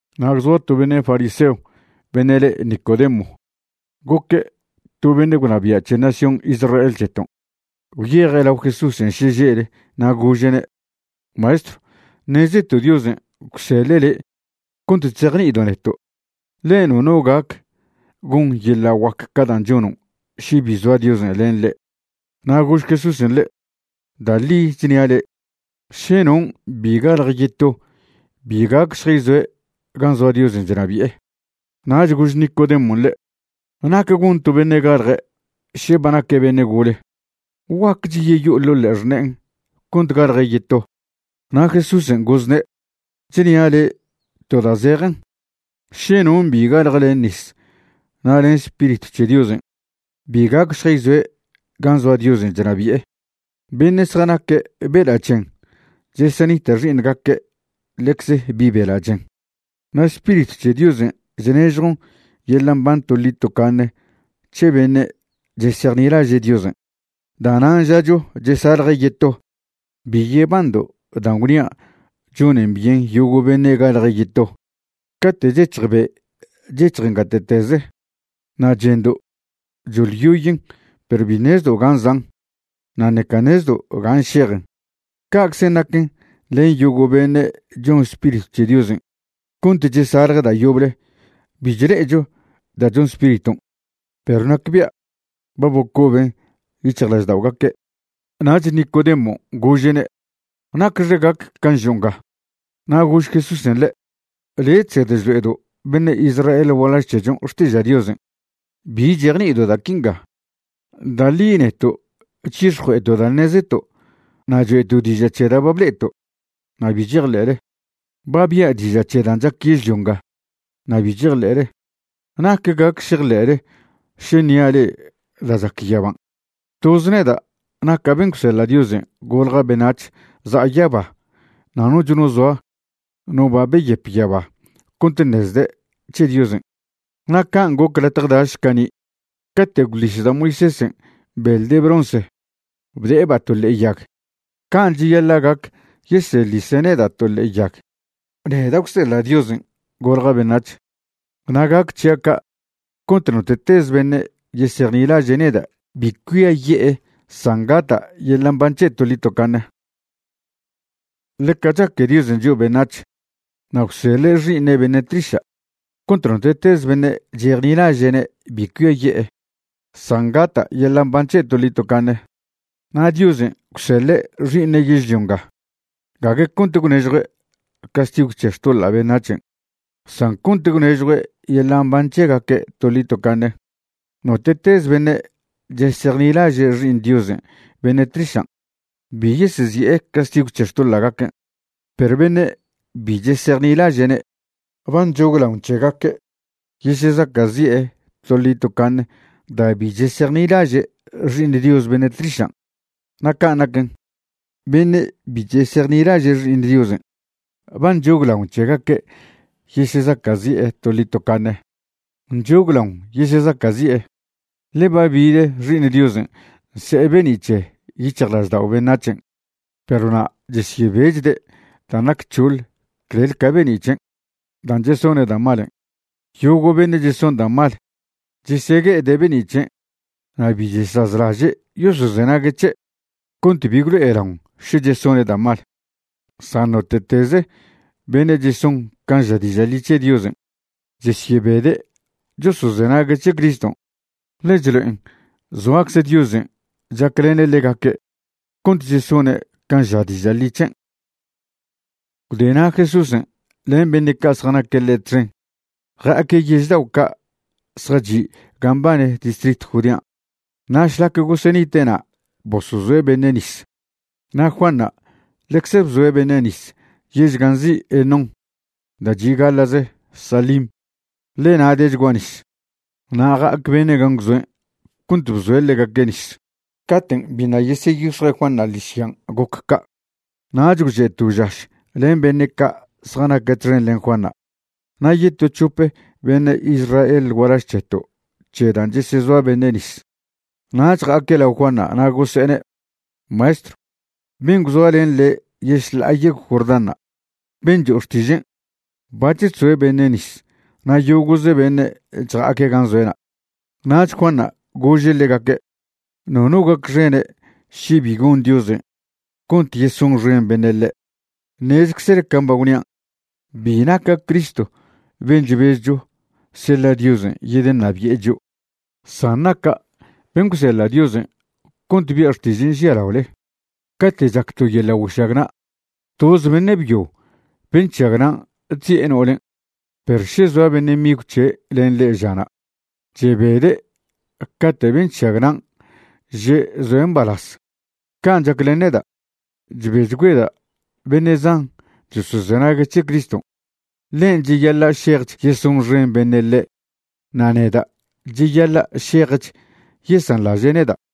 Na' gwzoa to beṉe' fariseo beṉe' le' Nicodemo. Goque' to beṉe' gwnabia' c̱he nación Israel c̱heton'. Gwyeje' lao Jesúsen' šeže'le na' gože'ne': ―Maestrw, ṉezeto' Diosen' gwseḻe' le' cont chzejni'ido' neto', ḻe nono gac gon yeḻa' guac ca' dan' chonon' še bi zoa Diosen' len ḻe'. Na' gož Jesúsen' ḻe': ―Da' ḻi chnia' le', še non' bi galje yeto bi gac šjayzoe' gan' zoa Diosen' chnabi'e. Nach gož Nicodemon' ḻe': ―¿Nac gon to beṉe' galje' še' ba naque' beṉe' gole? ¿Guaquech yeyo'e ḻo' ḻe'e xṉe'en' cont galje' yeto? Na' Jesúsen' gozne': ―Chnia' le'e to da' zejen, še non' bi galje' len nis na' len Spiritw c̱he Diosen', bi gac šjayzoe' gan' zoa Diosen' chnabi'e. Beṉe' zjanaque' bela' chen chesenita' xi'iṉgaque' ḻecze bi' bela' chen. Na' Spiritw c̱he Diosen' chnežjon yeḻa' mban toḻi tocaṉe c̱he beṉe' chesejnilaže' Diosen'. Da'nan' žacho chesalje' yeto. Bi yebando' dan' gwnia' chonen byen yogo' beṉe' galje' yeto. Cate' chec̱hj be' chec̱hjen gate'teze, na' chendo' choḻyoyen perw bi ṉezdo' ga zan' na' ṉeca ṉezdo' ga šejen. Ca'czen' naquen len yogo' beṉe' chon Spiritw c̱he Diosen' cont chesalje' da' yoble. Bi chle'echo da' chon Spiriton' perw nacbia' ba bocoben yic̱hjlažda'ogaque'. Nach Nicodemon' gože'ne': ―¿Nacxe gac can' žo' nga? Na' gož Jesúsen' ḻe': ―Le' chsed chlo'edo' beṉe' Israel gualaž c̱hechon' xtiža' Diosen', ¿bi chejni'ido' da' quinga? Da' ḻi neto' chyix̱jue'eto' da' ṉezeto' na' choe'to' diža' c̱he da' ba ble'eto' na' bi chejḻe'le. Ba bia' diža' c̱he dan' chac yežlio nga na' bi chejḻe'ele. ¿Nac gac šejḻe'le še ṉia' le'e da' chac yaban'? ’Toze neda' naca' ben' gwseḻa' Diosen' golja' beṉac̱h za'a yaba na' noch no zoa no ba beyep yaba cont ṉezde' c̱he Diosen'. Na' can' goc latje daš cani' cate' gwḻis da' Moisésen' beḻ de bronce bde'eba' to ḻe'e yag, can' cheyaḻa' gac yeseḻise' neda' to ḻe'e yag, neda' gwseḻa' Diosen' golja' beṉac̱h. Na' gac c̱hia' ca' cont note'teze beṉe' yesejnilaže' neda' bi cuiaye'e san gata' yeḻa' mban c̱he' toḻi tocaṉe. ’Ḻeca chaque Diosen' chio' beṉac̱h, na' gwseḻa' Xi'iṉe' beṉe' tliša' cont note'tez beṉe' chejnilaže'ne' bi cuiaye'e, san gata' yeḻa' mban c̱he' toḻi tocaṉe. Na' Diosen' gwseḻe' Xi'iṉen' yežlio nga gague cont gwnežjue' castigw c̱he xtoḻa' beṉac̱hen', san cont gwnežjue' yeḻa' mban c̱hegaque' toḻi tocaṉe. ’Note'tez beṉe' chesejnilaže' Xi'iṉ Diosen' beṉe' tlišan', bi yesezi'e castigw c̱he xtoḻa'gaquen', perw beṉe' bi chesejnilaže'ne' ba nchoglaon c̱hegaque' yesezaca'zi'e toḻi tocaṉe da' bi chesejnilaže' Xi'iṉ Dios beṉe' tlišan'. Na' can' naquen, beṉe' bi chesejnilaže' Xi'iṉ Diosen' ba nchoglaon c̱hegaque' yesezaca'zi'e toḻi tocaṉe. Nchoglaon yesezacazi'e, ḻe ba bid Xi'iṉ Diosen' nse'e be'ni' c̱he yic̱hjlaždao' beṉac̱hen' perw na' chesyebechde' dan' nac c̱hoḻ clel ca be'ni' c̱hen', dan' chesone' da' malen'. Yogo' beṉe' cheson da' mal chesegue'ede' be'ni' c̱hen' na' bi chesazlaže' yosozenague' c̱he' cont bi gwlo'elaon še chesone' da' mal. San note'tez beṉe' cheson can' ža diža' ḻi c̱he Diosen', chesyebede' chosozenague' c̱he Criston', ḻe chlo'en zoacze Diosen' chaclene' ḻegaque' cont chesone' can' ža diža' ḻi c̱hen'. Gwde na' Jesúsen' len beṉe' ca' zjanaque' ḻe' txen ja'aque' yež dao' ca' zjachi' gan' mbane distritw Judean'. Na' šlac gosenite' na' bosozoe' beṉe' nis. Na' Juanṉa' ḻecze bzoe' beṉe' nis yež gan' nzi' Enón da' chi' gaḻa'ze Salim, ḻe na' dechgua nis. Na' ja'ac beṉe' gan' gwzoen' cont bzoe' ḻegaque' nis. Caten' biṉa' yeseyix̱jue' Juanṉa' ḻižyan' goc ca'. Nach gwche' to žaš len beṉe' ca' zjanaque' txen len Juanṉa' na' yeto c̱hope beṉe' Israel gualaž c̱heto' c̱he dan' chesezoa beṉe' nis. Nach ja'aque' lao Juanṉa' na' gose'ene': ―Maestrw, ben' gwzoa len le' yešḻa'a yegw Jordánṉa', ben' cho'o xtižen', bac̱h chzoe' beṉe' nis na' yogo'ze beṉe' chja'aque' gan' zoe'na'. Nach Juanṉa' gože' ḻegaque': ―Nono gacxene' še bi gon Diosen' cont yesonxen beṉe' ḻe'. Ṉezczele can' ba gwnian', bi naca' Cristo ben' chbezcho seḻa' Diosen' yedeṉabi'e chio', san naca' ben' gwseḻa' Diosen' cont bia' xtižen' žialaole. Cate' chac to yeḻa' güešagna', toz beṉe' byo ben' chšagnan' chzi'e no'olen'. Perw še zoa beṉe' migw c̱he' len ḻe' ža'na, chebede' cate' ben' chšagnan' že' zoe' mbalaz. Can' chac len neda', chbechgüeda' beṉe' zan chosozenague' c̱he Criston'. Ḻen' cheyaḻa' šejch yesonxen beṉe' ḻe' na' neda' cheyaḻa' šejch yesanḻaže' neda'.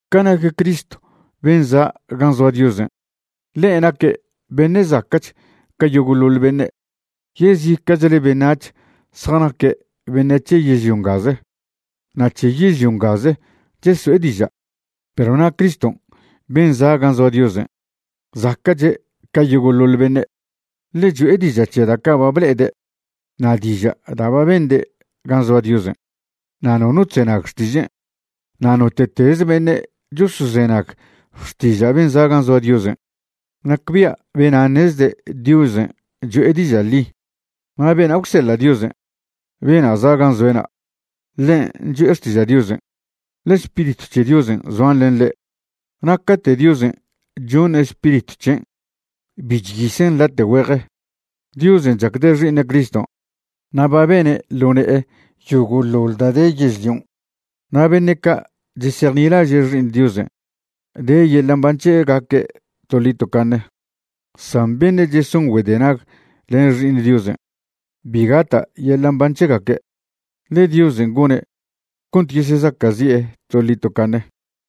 Ca nac Cristo ben' za' gan' zoa Diosen', ḻe' naque' beṉe' zaca'ch ca yogo'ḻoḻ beṉe'. Yezica'chle beṉac̱h zjanaque' beṉe' c̱he yežlio ngaze na' c̱he yežlio ngaze cheso'e diža'. Perw na' Cristo ben' za' gan' zoa Diosen' zaca'che' ca yogo'ḻoḻ beṉe'. Ḻe' cho'e diža' c̱he da' ca' ba ble'ede' na' diža' da' ba bende' gan' zoa Diosen', na' nono chzenag xtižen'. Na' note'tez beṉe' chosozenag xtiža' ben' za' gan' zoa Diosen', nacbia' bena' ṉezde' Diosen' cho'e diža' ḻi. Na' bena' gwseḻa' Diosen', bena' za' gan' zoe'na', ḻen' cho'e xtiža' Diosen', ḻe Spiritw c̱he Diosen' zoan len ḻe', na' cate' Diosen' choṉe' Spiritw c̱hen' bi chyisen' late' güeje. Diosen' chacde' Xi'iṉe' Criston' na' ba bene' ḻo ne'e yogo'ḻoḻ da' de yežlion'. Na' beṉe' ca' chesejnilaže' Xi'iṉ Diosen' de yeḻa' mban c̱hegaque' toḻi tocaṉe, san beṉe' cheson güedenag len Xi'iṉ Diosen', bi gata' yeḻa' mban c̱hegaque', ḻe Diosen' gone' cont yesezaca'zi'e toḻi tocaṉe.